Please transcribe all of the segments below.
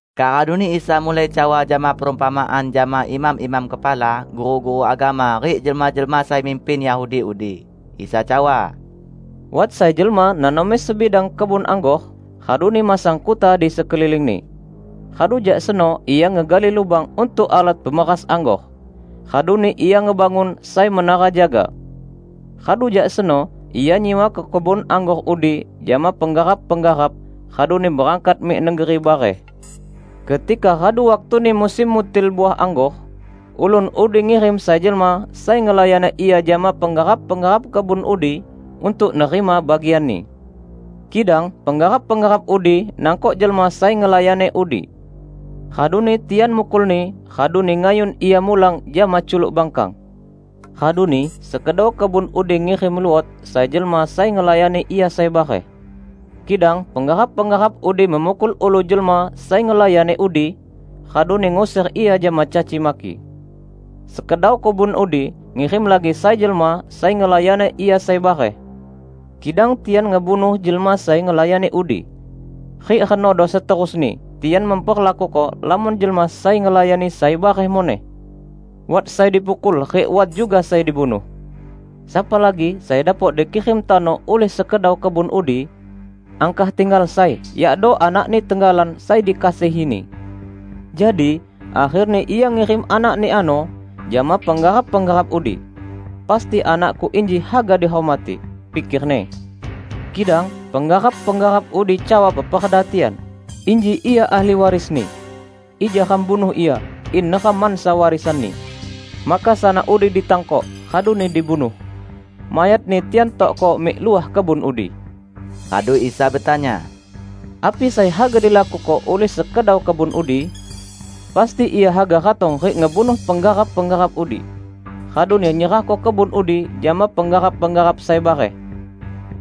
Kak raduni Isa mulai cawa jama perumpamaan jama imam-imam kepala, guru-guru agama rik jelma-jelma sai mimpin Yahudi udi. Isa cawa, "Wat sai jelma nanomi sebidang kebun anggor, raduni masang kuta di sekelilingni. Radu jak seno ia ngegali lubang untuk alat pemeras anggor, raduni ia ngebangun sai menara jaga. Radu jak seno ia nyiwako kebun anggor udi jama penggarap-penggarap raduni berangkat mik negeri bareh. Ketika radu waktuni musim mutil uah anggor, ulun udi ngirim sai jelma sai ngelayani ia jama penggarap-penggarap kebun udi, untuk nerima bagianni. Kidang penggarap-penggarap udi nangkok jelma sai ngelayani udi. Raduni tian mukulni, raduni ngayun ia mulang jama culuk bangkang. Raduni sekedau kebun udi ngirim luot sai jelma sai ngelayani ia sai bareh. Kidang penggarap-penggarap udi memukul ulu jelma sai ngelayani udi, raduni nguser ia jama caci maki. Sekedau kebun udi ngirim lagi sai jelma sai ngelayani ia sai bareh. Kidang tian ngebunuh jelma sai ngelayani udi. Rik renodo seterusni tian memperlakuko lamon jelma sai ngelayani sai bareh muneh: wat sai dipukul rik wat juga sai dibunuh. Sapa lagi sai dapok dikirim tano ulih sekedau kebun udi? Angkah tinggal sai, yakdo anakni tenggalan sai dikasihini. Jadi akherni ia ngirim anakni ano jama penggarap-penggarap udi. 'Pasti anakku inji haga dihormati,' pikerni. Kidang penggarap-penggarap udi cawa peperda tian, 'Inji ia ahli warisni. Ija ram bunuh ia, in neram mansa warisanni!' Maka sanak udi ditangkok, raduni dibunuh. Mayatni tian tokko mik luah kebun udi." Radu Isa betanya, "Api sai haga dilakuko ulih sekedau kebun udi? Pasti ia haga ratong rik ngebunuh penggarap-penggarap udi, raduni nyerahko kebun udi jama penggarap-penggarap sai bareh.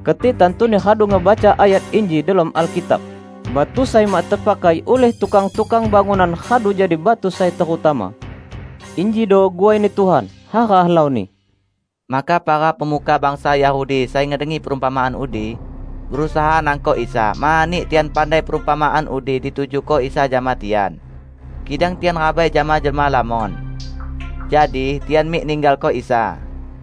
Keti tantuni radu ngebaca ayat inji delom Alkitab, 'Batu sai mak tepakai ulih tukang-tukang bangunan radu jadi batu sai terutama. Injido guwai-Ni Tuhan; hara helauni!' " Maka para pemuka bangsa Yahudi sai ngedengi perumpamaan udi, berusaha nangkok Isa, mani tian pandai perumpamaan udi ditujuko Isa jama tian. Kidang tian rabai jama jelma lamon. Jadi, tian mik ninggalko Isa.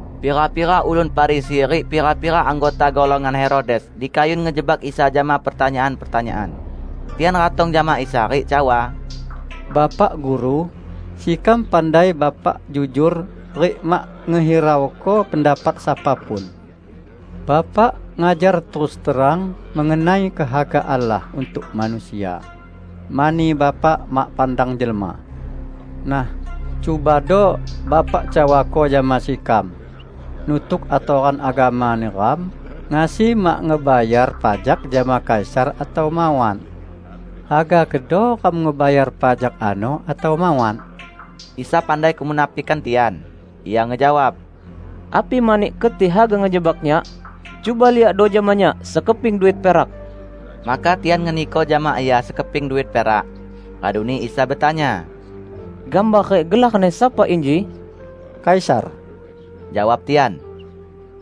Pira-pira ulun Farisi rik pira-pira anggota golongan Herodes dikayun ngejebak Isa jama pertanyaan-pertanyaan. Tian ratong jama Isa rik cawa, "Bapak Guru, sekam pandai Bapak jujor rik mak ngehirauko pendapat sapa pun. Bapak ngajar terus terang mengenai kehaga Allah untuk manusia, mani Bapak mak pandang jelma. Nah, cubado Bapak cawako jama sekam, 'Nutuk atoran agama neram, ngasi mak ngebayar pajak jama Kaisar atau mawat? Haga kedo ram ngebayar pajak ano, atau mawat?' " Isa pandai kemunafikan tian. Ia ngejawab, "Api mani keti haga ngejebak Nyak? Cuba liakdo jama Nyak sekeping duit perak." Maka tian ngeniko jama Ia sekeping duit perak. Raduni Isa betanya, "Gambar rik gelarni sapa inji?" "Kaisar," jawab tian.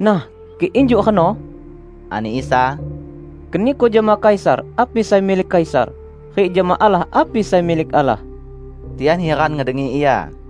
"Nah, kik injuk reno," ani Isa, "keniko jama Kaisar api sai milik Kaisar, rik jama Allah api sai milik Allah." Tian hiran ngedengi Ia.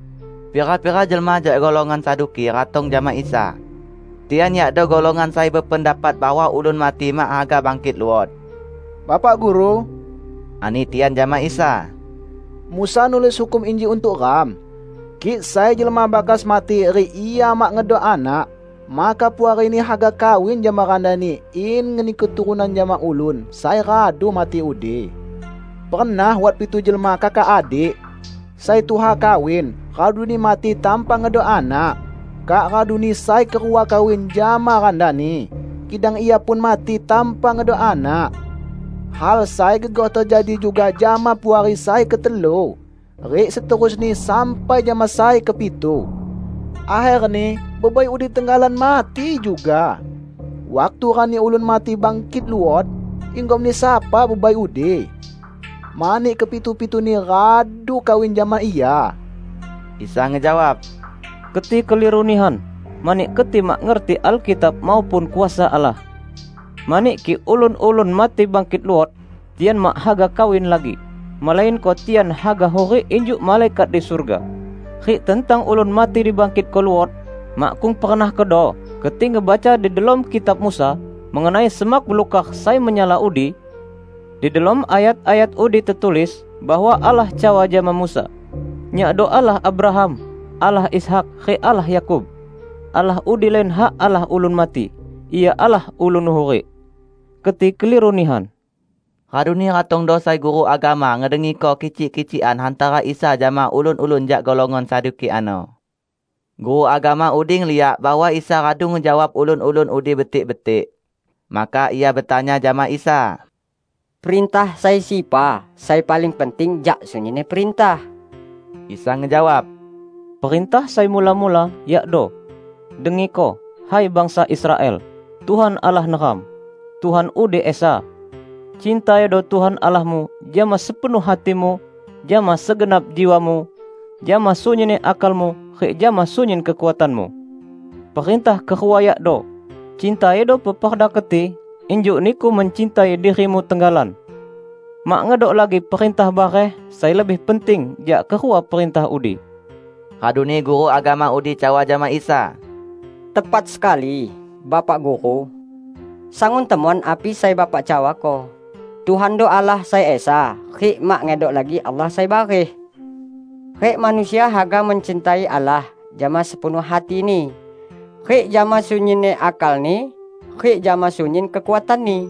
Pira-pira jelma jak golongan Saduki ratong jama Isa. (Tian yakdo golongan sai bependapat bahwa ulun mati mak haga bangkit luot.) "Bapak Guru," ani tian jama Isa, "Musa nulis hukum inji untuk ram: 'Kik sai jelma bakas mati rik ia mak ngedok anak, maka puarini haga kawin jama randani in ngeni keturunan jama ulun sai radu mati udi.' Pernah wat pitu jelma kakak adik. Sai tuha kawin, raduni mati tanpa ngedok anak. Kak raduni sai kerua kawin jama randani, kidang ia pun mati tanpa ngedok anak. Hal sai gegoh tejadi juga jama puari sai ketelu, rik seterusni sampai jama sai kepitu. Akherni bebai udi tenggalan mati juga. Waktu rani ulun mati bangkit luot, inggomni sapa bebai udi? Mani kepitu-pituni radu kawin jama ia!" Isa ngejawab, "Keti keliru nihan. Mani keti mak ngerti Alkitab maupun kuasa Allah. Mani kik ulun-ulun mati bangkit luot, tian mak haga kawin lagi, melainko tian haga hurik injuk malaikat di surga. Rik tentang ulun mati dibangkitko luot, makkung pernah kedo keti ngebaca di delom kitab Musa mengenai semak belukar sai menyala udi? Di delom ayat-ayat udi tetulis bahwa Allah cawa jama Musa, 'Nyakdo Allah Abraham, Allah Ishak rik Allah Yakub.' Allah udi lain hak Allah ulun mati. Ia Allah ulun hurik. Keti keliru nihan!" Raduni ratongdo sai guru agama ngedengiko kicik-kicikan hantara Isa jama ulun-ulun jak golongan Saduki ano. Guru agama udi ngeliak bahwa Isa radu ngejawab ulun-ulun udi betik-betik. Maka ia betanya jama Isa, "Perintah sai sepa sai paling penting jak sunyinni perintah?" Isa ngejawab, "Perintah sai mula-mula, yakdo: 'Dengiko, hai bangsa Israel! Tuhan Allah neram, Tuhan udi esa. Cintaido Tuhan Allahmu jama sepenuh hatimu, jama segenap jiwamu, jama sunyinni akalmu rik jama sunyin kekuatanmu.' Perintah kerua yakdo: 'Cintaido peperda keti, injuk niku mencintai dirimu tenggalan.' Mak ngedok lagi perintah bareh sai lebih penting jak kerua perintah udi." Raduni guru agama udi cawa jama Isa, "Tepat sekali, Bapak Guru! Sangun temon api sai Bapak cawako: Tuhando Allah sai esa, rik mak ngedok lagi Allah sai bareh. Rik manusia haga mencintai Allah jama sepenuh hatini, rik jama sunyinni akalni rik jama sunyin kekuatanni.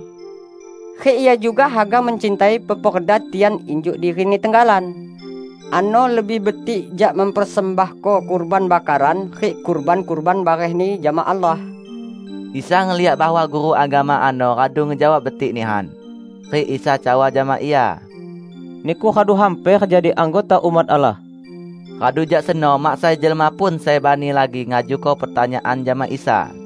Rik ia juga haga mencintai peperda tian injuk dirini tenggalan. Ano lebih betik jak mempersembahko kurban bakaran rik kurban-kurban barehni jama Allah." Isa ngeliak bahwa guru agama ano radu ngejawab betik nihan. Rik Isa cawa jama ia, "Niku radu hamper jadi anggota umat Allah." Radu jak seno mak sai jelma pun sai bani lagi ngajuko pertanyaan jama Isa.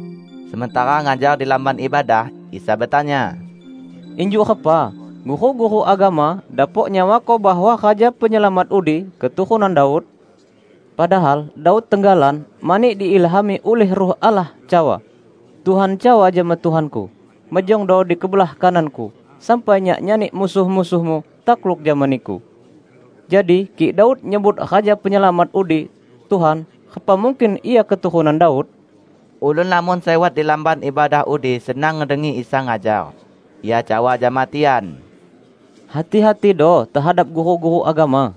Sementara ngajar di Lamban Ibadah, Isa betanya, "Injuk repa guru-guru agama dapok nyawako bahwa Raja Penyelamat udi keturunan Daud? Padahal Daud tenggalan -- mani diilhami ulih Ruh Allah -- cawa, 'Tuhan cawa jama Tuhanku: mejongdo di kebelah kanan-Ku sampai Nyak nyani musuh-musuh-Mu takluk jama Niku.' Jadi kik Daud nyebut Raja Penyelamat udi 'Tuhan', repa mungkin Ia keturunan Daud?" Ulun lamon sai wat di Lamban Ibadah udi senang ngedengi Isa ngajar. Ia cawa jama tian, "Hati-hatido tehadap guru-guru agama.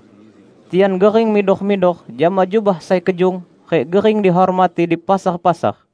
Tian gering midor-midor jama jubah sai kejung rik gering dihormati di pasar-pasar.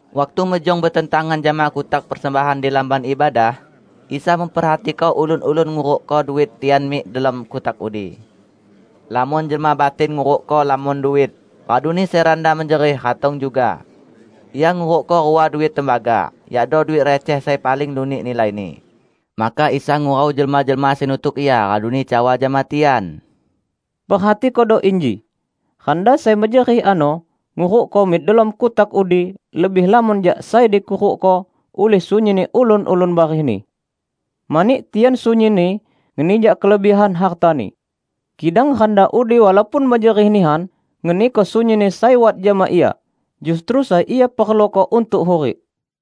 Waktu mejong betentangan jama kutak persembahan di Lamban Ibadah, Isa memperhatiko ulun-ulun ngurukko duit tian mik delom kutak udi. Lamon jelma batin ngurukko lamon duit; raduni sai randa mejerih ratong juga. Ia ngurukko rua duit tembaga, yakdo duit receh sai paling lunik nilaini. Maka Isa ngurau jelma-jelma sai nutuk Ia raduni cawa jama tian, "Perhatikodo inji: Randa sai mejerih ano ngurukko mik delom kutak udi lebih lamon jak sai dikurukko ulih sunyinni ulun-ulun barehni. Mani tian sunyinni ngeni jak kelebihan hartani. Kidang randa udi walaupun mejerih nihan ngeniko sunyinni sai wat jama ia -- justru sai ia perluko untuk hurik."